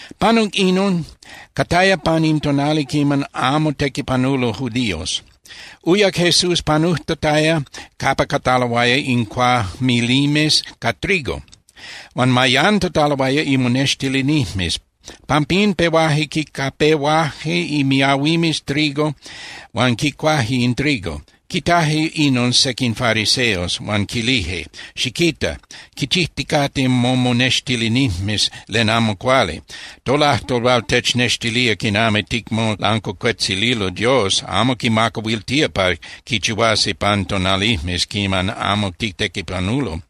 Panuc inon, cataya pan in tonali quiman amo tequipanulo judíos, uyac Jesús panujtataya capa cataloaya in cuajmilimes ca trigo. Huan mayantataloaya imonextilinijmes. Pampín pehuaje quincapehuaje imiahuimes trigo huan quicuaje in trigo. Quitaje inon sequin fariseos, huan quilije: —Xiquita. Quichijticate momonextilinijmes len amo cuali. Tolajtol hual technextilía quinami ticmolancuacuetzililo Dios amo quimacahuiltía pa quichihuasi pan tonalijmes quiman amo titequipanulo.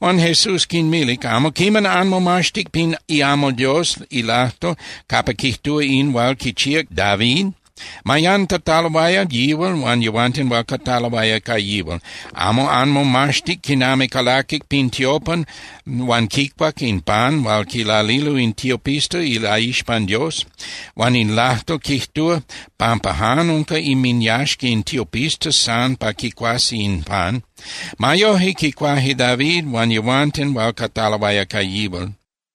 Huan Jesús quinmilic: —¿Amo quiman anmomaxtic pin iamal Dios ilajtol capa quijtúa in hual quichíac David? Mayantataloaya yihual huan yehuanten hual cataloaya ca yihual. ¿Amo anmomaxtic quinami calaquic pin tiopan huan quicuac in pan hual quilalilo in tiopistas ilaixpan Dios? Huan in lajtol quijtúa pampa jan unca inminyaxca in tiopistas san pa quicuasi in pan. Ma yoje quicuaje David huan yehuanten hual cataloaya ca yihual.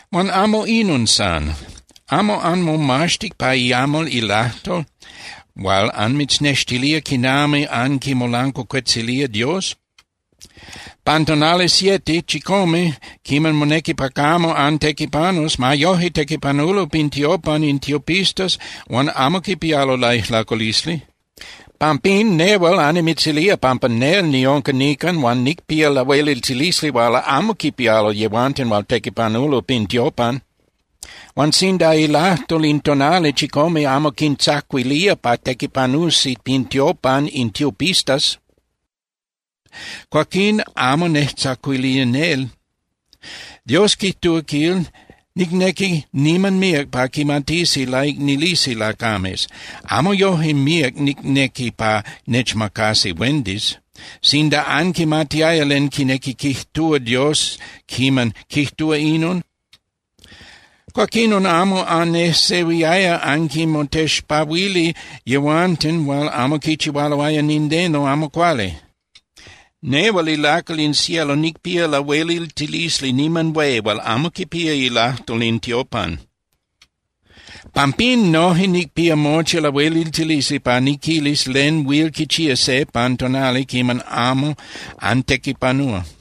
Huan amo inon san. ¿Amo anmomaxtic pa iamal ilajtol hual anmitznextilía quinami anquimolancuacuetzilía Dios? Pan tonali siete (chicome) quiman monequi pa camo antequipanus, ma yoje tequipanulo pin tiopan in tiopistas huan amo quipialo laijlaculisli. Pampín, nehual annimitzilía pampa nel niunca nican huan nicpía lahueliltilisli hual amo quipialo yehuanten hual tequipanulo pin tiopan. Huan sinda ilajtol in tonali chicome amo quintzacuilía pa tequipanusi pin tiopan in tiopistas, cuaquín amo nejtzacuilía nel. Dios quijtúa, quil: “Nicnequi niman míac pa quimatisi laicnilisi lacames. Amo yoje míac nicnequi pa nechmacasi huendis.” Sinda anquimatiaya len quinequi quijtúa Dios quiman quijtúa inon, cuaquinon amo anejsehuiaya anquinmotexpahuili yehuanten hual amo quichihualoaya nindeno amo cuali. Nehual ilacal in cielo nicpía lahueliltilisli niman hué hual amo quipía ilajtol in tiopan. Pampín noje nicpía mochi lahueliltilisli pa niquilis len huil quichía se pan tonali quiman amo antequipanúa.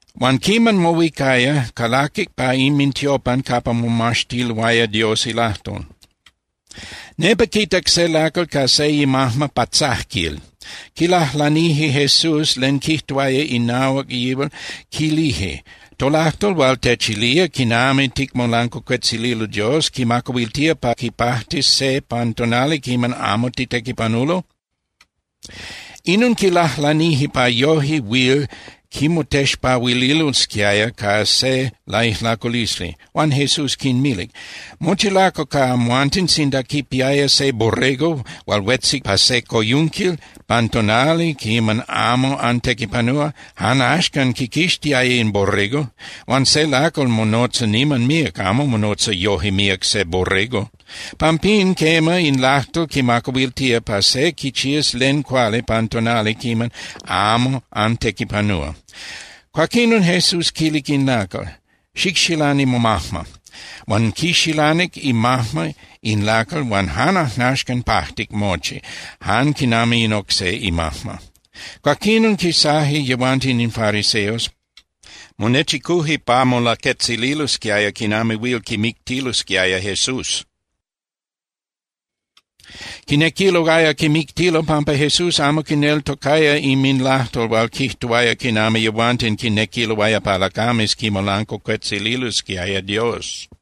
Huan quiman mohuicaya, calaquic pa inmintiopan capa momaxtiloaya Dios ilajtol. Nepa quitac se lacal ca se imajma patzajquil. Quilajlanije Jesús len quijtuaya inahuac yihual, quilije: —¿Tolajtol hual techilía quinami ticmolancuacuetzililo Dios quimacahuiltía pa quipajtis se pan tonali quiman amo titequipanulo? Inon quilajlanije pa yoje huil quimotexpahuililosquiaya ca se laijlaculisli. Huan Jesús quinmilic: —Mochi lacal ca amhuanten sinda quipiaya se borrego hual huetzic pa se coyunquil pan tonali quiman amo antequipanúa, jan axcan quiquixtiaya in borrego. Huan se lacal monotza niman míac, amo monotza yoje míac se borrego. Pampín, quema, in lajtol quimacahuiltía pa se quichías len cuali pan tonali quiman amo antequipanúa. Cuaquinon Jesús quilic in lacal: —Xicxilani momajma. Huan quixilanic imajma in lacal huan jan ajnaxcan pajtic mochi, jan quinami in oc se imajma. Cuaquinon quisaje yehuanten in fariseos, monechicuje pa molaquetzililosquiaya quinami huil quimictilosquiaya Jesús. Quinequiloaya quimictilo pampa Jesús amo quineltocaya inminlajtol hual quijtuaya quinami yehuanten quinequiloaya pa lacames quimolancuacuetzililosquiaya Dios.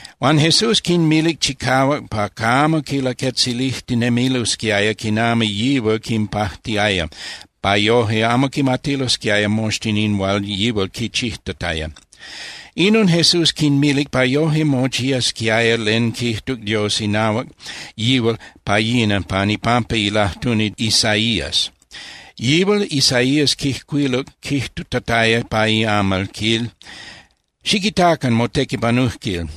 Huan Jesús quinmilic chicahuac pa camo quilaquetzilijtinemilosquiaya quinami yihual quinpajtiaya pa yoje amo quimatilosquiaya moxtin in hual yihual quichijtataya. Inon Jesús quinmilic pa yoje mochiasquiaya len quijtuc Dios inahuac yihual pa yina pan ipampa ilajtuni Isaías. Yihual Isaías quijcuiluc quijtutataya pa iamal, quil: Xiquitacan notequipanujquil.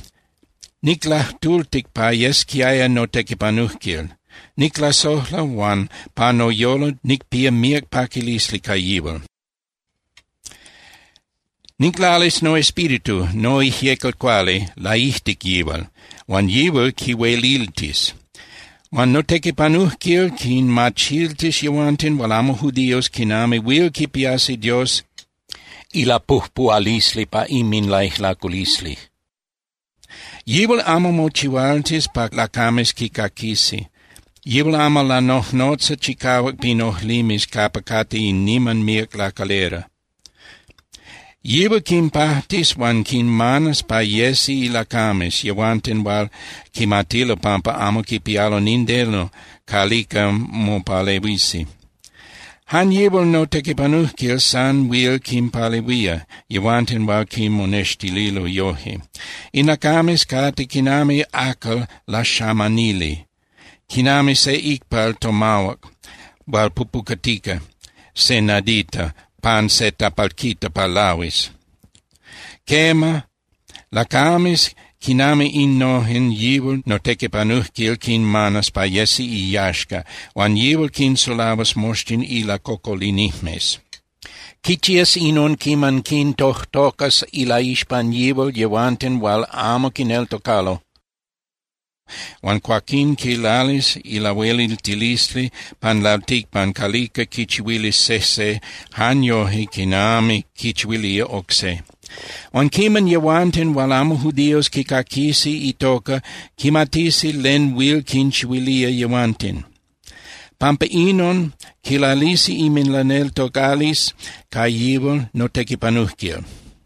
Niclajtultic pa yesquiaya notequipanujquil. Niclasojla huan pa noyolo nicpía míac paquilisli ca yihual. Niclalis noEspíritu (noIjyecal Cuali) laijtic yihual, huan yihual quihueliltis. Huan notequipanujquil quinmachiltis yehuanten hual amo judíos quinami huil quipiasi Dios ilapujpuhualisli pa inminlaijlaculisli. Yihual amo mochihualtis pa lacames quicaquisi. Yihual amo lanojnotzas chicahuac pin ojlimes capa cate in niman míac lacalera. Yihual quinpajtis huan quinmanas pa yesi ilacames yehuanten hual quimatilo pampa amo quipialo nindeno calica mopalehuisi. Jan yihual notequipanujquil san huil quinpalehuía yehuanten hual quimonextililo yoje. In lacames cate quinami acal laxamanili, quinami se icpal tomahuac hual pupucatica se nadita pan se tapalquita pa lahuis. Quema, lacames quinami innojen yihual notequipanujquil quinmanas pa yesi iyaxca huan yihual quinsulahuas moxtin ilacocolinijmes. Quichías inon quiman quintojtocas ilaixpan yihual yehuanten hual amo quineltocalo huan cuaquín quilalis ilahueliltilisli pan lalticpan calica quichihuilis sejse jan yoje quinami quichihuilía oc se. Huan quiman yehuanten hual amo judíos quicaquisi itoca, quimatisi len huil quinchihuilía yehuanten. Pampa inon quilalisi inminlaneltocalisli ca yihual notequipanujquil.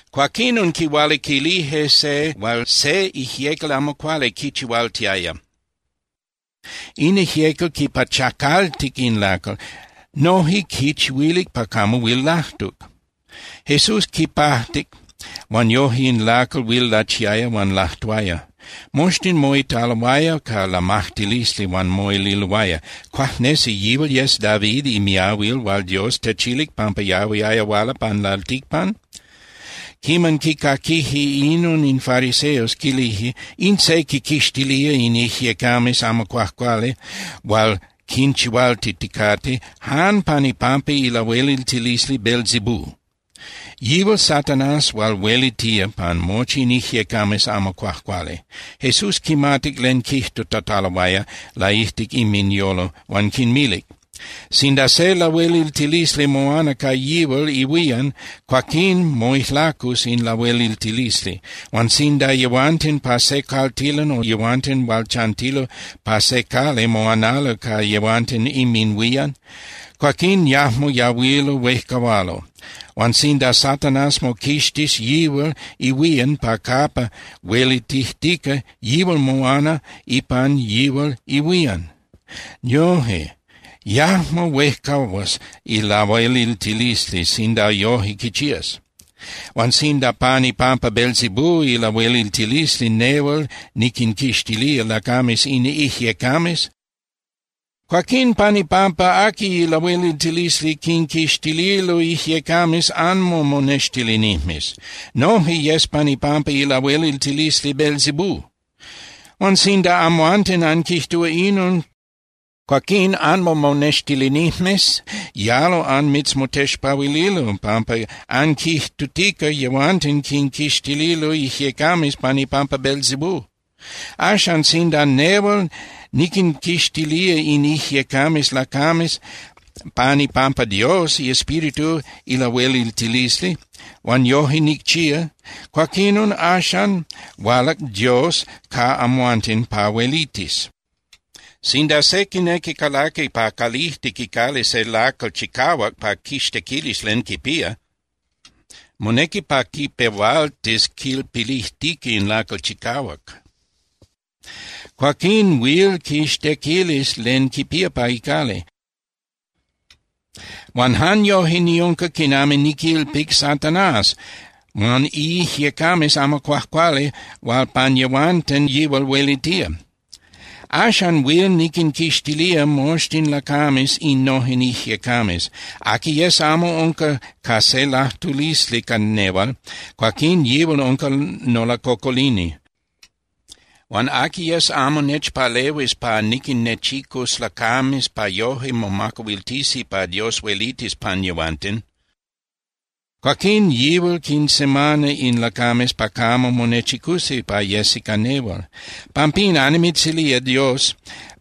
Cuaquinon quihualiquilije se hual se ijyecal amo cuali quichihualtiaya. In ijyecal quipachacaltic in lacal, noje quichihuilic pa camo huil lajtuc. Jesús quipajtic huan yoje in lacal huil lachiaya huan lajtuaya. Moxtin moitaloaya ca lamajtilisli huan moililoaya: —¿Cuajnesi yihual yes David imiahuil hual Dios techilic pampa yahuiaya huala pan lalticpan? Quiman quicaquije inon in fariseos, quilije: —In se quinquixtilía in ijyecames amo cuajcuali hual quinchihualtiticate jan pan ipampa ilahueliltilisli Beelzebú. Yihual Satanás hual huelitía pan mochi in ijyecames amo cuajcuali. Jesús quimatic len quijtutataloaya laijtic inminyolo huan quinmilic: —Sinda se lahueliltilisli moana ca yihual ihuían, cuaquín moijlacus in lahueliltilisli. Huan sinda yehuanten pa se caltilan o yehuanten hual chantilo pa se cali moanalo ca yehuanten inminhuían, cuaquín yajmo yahuilo huejcahualo. Huan sinda Satanás moquixtis yihual ihuían pa capa huelitijtica, yihual moana ipan yihual ihuían. Yoje, yajmo huejcahuas ilahueliltilisli sinda yoje quichías. Huan sinda pan ipampa Beelzebú ilahueliltilisli nehual niquinquixtilía lacames in ijyecames, cuaquín ¿pan ipampa aqui ilahueliltilisli quinquixtililo ijyecames anmomonextilinijmes? Noje yes pan ipampa ilahueliltilisli Beelzebú. Huan sinda amhuanten anquijtúa inon, cuaquín anmomonextilinijmes yalo anmitzmotexpahuililo, pampa anquijtutica yehuanten quinquixtililo ijyecames pan ipampa Beelzebú. Axan, sinda nehual niquinquixtilía in ijyecames lacames pan ipampa Dios iEspíritu ilahueliltilisli, huan yoje nicchía, cuaquinon axan hualac Dios ca amhuanten pa huelitis. ’Sinda se quinequi calaqui pa calijtic icali se lacal chicahuac pa quixtequilis len quipía, monequi pa quipehualtis quilpilijtica in lacal chicahuac. Cuaquín huil quixtequilis len quipía pa icali. Huan jan yoje niunca quinami niquilpic Satanás huan iijyecames amo cuajcuali hual pan yehuanten yihual huelitía. Axan huil niquinquixtilía moxtin lacames innojen ijyecames. Aqui yes amo unca ca se lajtulisli ca nehual, cuaquín yihual unca nolacocolini. Huan aqui yes amo nechpalehuis pa niquinnechicus lacames pa yoje momacahuiltisi pa Dios huelitis pan yehuanten, cuaquín yihual quinsemana in lacames pa camo monechicusi pa yesi ca nehual. ’Pampín, annimitzilía Dios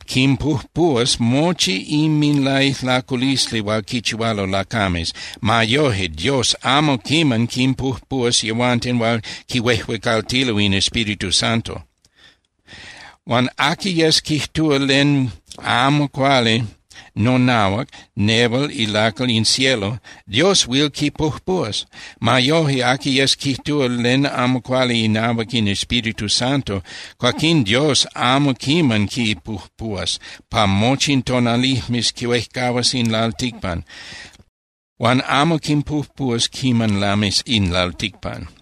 quinpujpuhuas mochi inminlaijlaculisli hual quichihualo lacames. Ma yoje, Dios amo quiman quinpujpuhuas yehuanten hual quihuejuecaltilo in Espíritu Santo. Huan aqui yes quijtúa len amo cuali nonahuac nehual ilacal in cielo, Dios huil quipujpuhuas. Ma yoje, aqui yes quijtúa len amo cuali inahuac in Espíritu Santo, cuaquín Dios amo quiman quipujpuhuas pa mochi in tonalijmes huejcahuas in lalticpan, huan amo quipujpuhuas quiman lamis in lalticpan.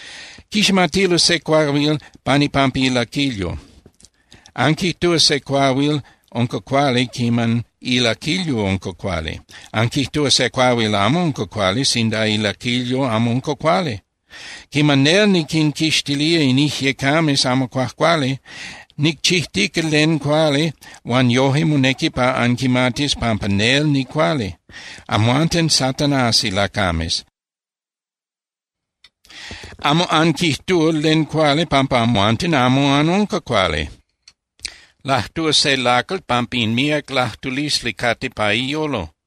’Quiximatilo se cuahuil pan ipampa ilaquilyo. Anquijtúa se cuahuil unca cuali quiman ilaquilyo unca cuali. Anquijtúa se cuahuil amo unca cuali sinda ilaquilyo amo unca cuali. Quiman nel niquinquixtilía in ijyecames amo cuajcuali, nicchijtica len cuali huan yoje monequi pa anquimatis pampa nel nicuali. ¡Amhuanten Satanás ilacames! Amo anquijtúa len cuali pampa amhuanten amo anunca cuali. Lajtúa se lacal pampa in míac lajtulisli cate pa iyolo.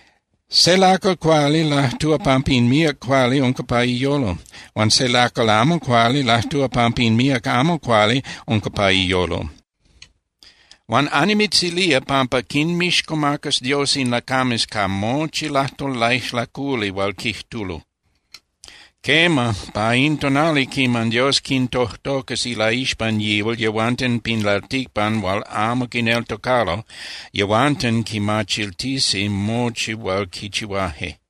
Se lacal cuali lajtúa pampa in míac cuali unca pa iyolo. Huan se lacal amo cuali lajtúa pampa in míac amo cuali unca pa iyolo. Huan annimitzilía pampa quinmixcomacas Dios in lacames ca mochi lajtol laijlaculi hual quijtulo. Quema, pa in tonali quiman Dios quintojtocas ilaixpan yihual yehuanten pin lalticpan hual amo quineltocalo, yehuanten quimachiltisi mochi hual quichihuaje.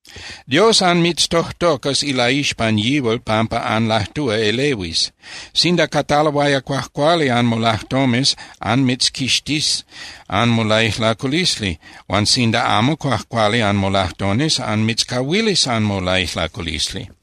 Dios anmitztojtocas ilaixpan yihual pampa anlajtúa elehuis. Sinda cataloaya cuajcuali anmolajtomes anmitzquixtís anmolaijlaculisli huan sinda amo cuajcuali anmolajtomes, anmitzcahuilis anmolaijlaculisli.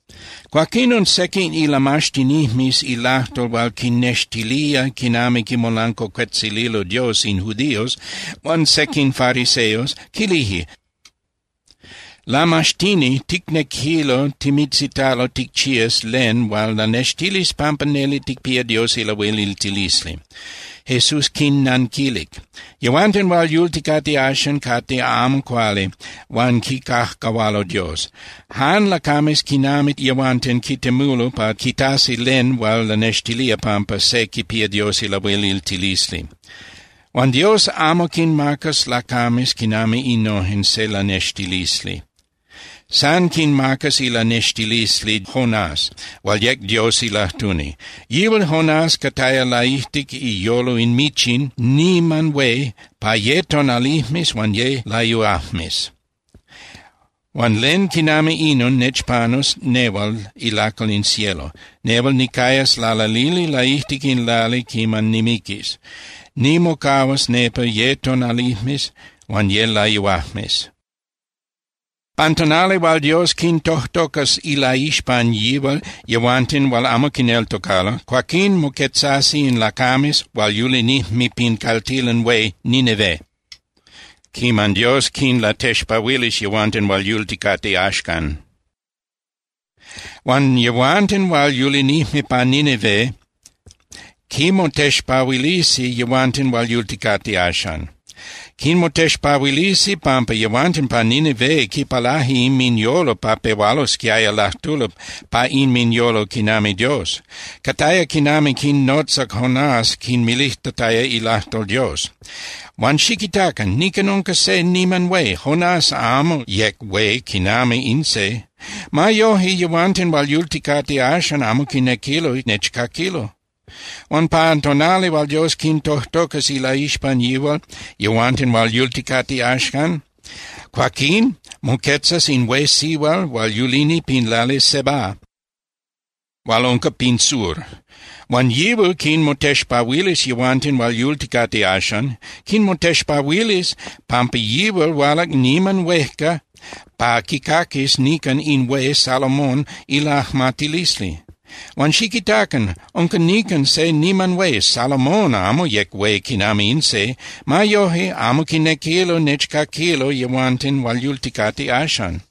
Cuaquinon sequin ilamaxtinijmes ilajtol hual quinnextilía quinami quimolancuacuetzililo Dios in judíos huan sequin fariseos quilije: —Lamaxtini, ticnequilo timitzitalo ticchías len hual lanextilis pampa neli ticpía Dios ilahueliltilisli. Jesús quinnanquilic: —Yehuanten hual yulticate axan cate amo cuali huan quicajcahualo Dios. Jan lacames quinami yehuanten quitemulo pa quitasi len hual lanextilía pampa se quipía Dios ilahueliltilisli. Huan Dios amo quinmacas lacames quinami innojen se lanextilisli. San quinmacas ilanextilisli Jonás, hual yec Dios ilajtuni. Yihual Jonás cataya laijtic iyolo in michin niman hué pa ye tonalijmes huan ye layuajmes. Huan len quinami inon nechpanus nehual ilacal in cielo. Nehual nicayas lalalili laijtic in lali quiman nimiquis. Nimocahuas nepa ye tonalijmes huan ye layuajmes. Pan tonali hual Dios quintojtocas ilaixpan yihual yehuanten hual amo quineltocalo, cuaquín moquetzasi in lacames hual yulinijme pin caltilan hué Nínive quiman Dios quinlatexpahuilis yehuanten hual yulticate axcan. Huan yehuanten hual yulinijme pa Nínive quinmotexpahuilisi yehuanten hual yulticate axan. Quinmotexpahuilisi pampa yehuanten pa Nínive quipalaje inminyolo pa pehualosquiaya lajtulo pa inminyolo quinami Dios. Cataya quiman quinnotzac Jonás quinmilijtataya ilajtol Dios. Huan xiquitacan. Nican unca se niman hué. Jonás amo yec hué quinami in se. Ma yoje yehuanten hual yulticate axan amo quinequilo nechcaquilo. Huan pan tonali hual Dios quintojtocas ilaixpan yihual yehuanten hual yulticate axan, cuaquín moquetzas in hué sihual hual yulini pin lali Sebá hual unca pin sur. Huan yihual quinmotexpahuilis yehuanten hual yulticate axan. Quinmotexpahuilis pampa yihual hualac niman huejca pa quicaquis nican in hué Salomón ilajmatilisli. Huan xiquitacan, unca nican se niman hué. Salomón amo yec hué quinami in se. Ma yoje amo quinequilo nechcaquilo yehuanten hual yulticate axan.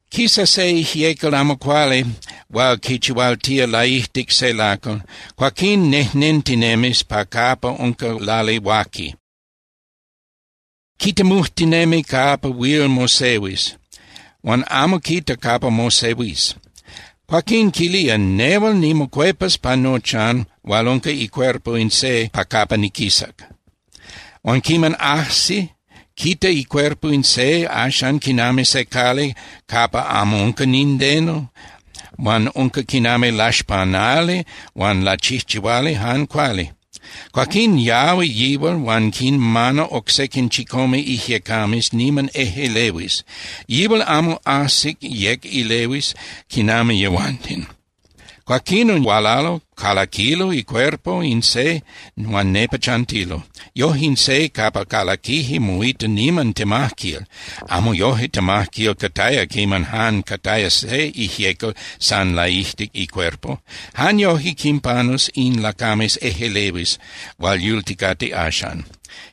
’Quisa se ijyecal amo cuali hual quichihualtía laijtic se lacal, cuaquín nejnentinemis pa capa unca lali huaqui. Quitemujtinemi capa huil mosehuis, huan amo quita capa mosehuis. Cuaquín quilía: “Nehual nimocuepas pa nochan hual unca icuerpo in se pa capa niquisac.” Huan quiman ajsi, quita icuerpo in se axan quinami se cali capa amo unca nindeno huan unca quinami laxpanali huan lachijchihuali jan cuali. Cuaquín yahui yihual huan quinmana oc sequin chicome ijyecames niman ejꞌelehuis. Yihual amo ajsic yec elehuis quinami yehuanten. Cuaquinon hualalo, calaquilo icuerpo in se huan nepa chantilo. Yoje in se capa calaquije moita niman temajquil. Amo yoje temajquil cataya quiman jan cataya se ijyecal san laijtic icuerpo. Jan yoje quinpanus in lacames ejꞌelehuis hual yulticate axan.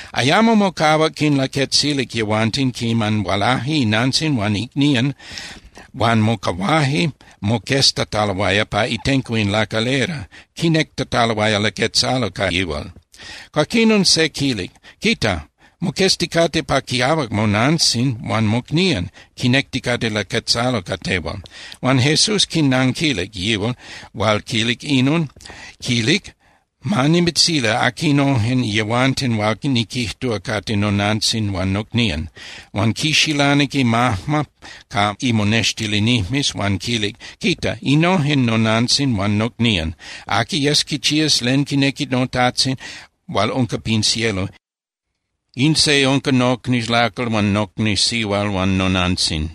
Ayamo mocahuac quinlaquetzilic yehuanten quiman hualaje inantzin huan icnían huan mocahuaje moqueztataloaya pa itenco in lacalera, quinectataloaya laquetzalo ca yihual. Cuaquinon se quilic: —Quita. Moquezticate pa quiahuac monantzin huan mocnían, quinecticate laquetzalo ca tehual. Huan Jesús quinanquilic yihual hual quilic inon, quilic: —Ma nimitzili aquinojen yehuanten hual niquijtúa cate nonantzin huan nocnían. Huan quixilanic imajma ca imonextilinijmes huan quilic: —Quita. Innojen nonantzin huan nocnían. Aqui yes quichías len quinequi noTajtzin hual unca pin cielo, in se unca nocni lacal huan nocni sihual huan nonantzin.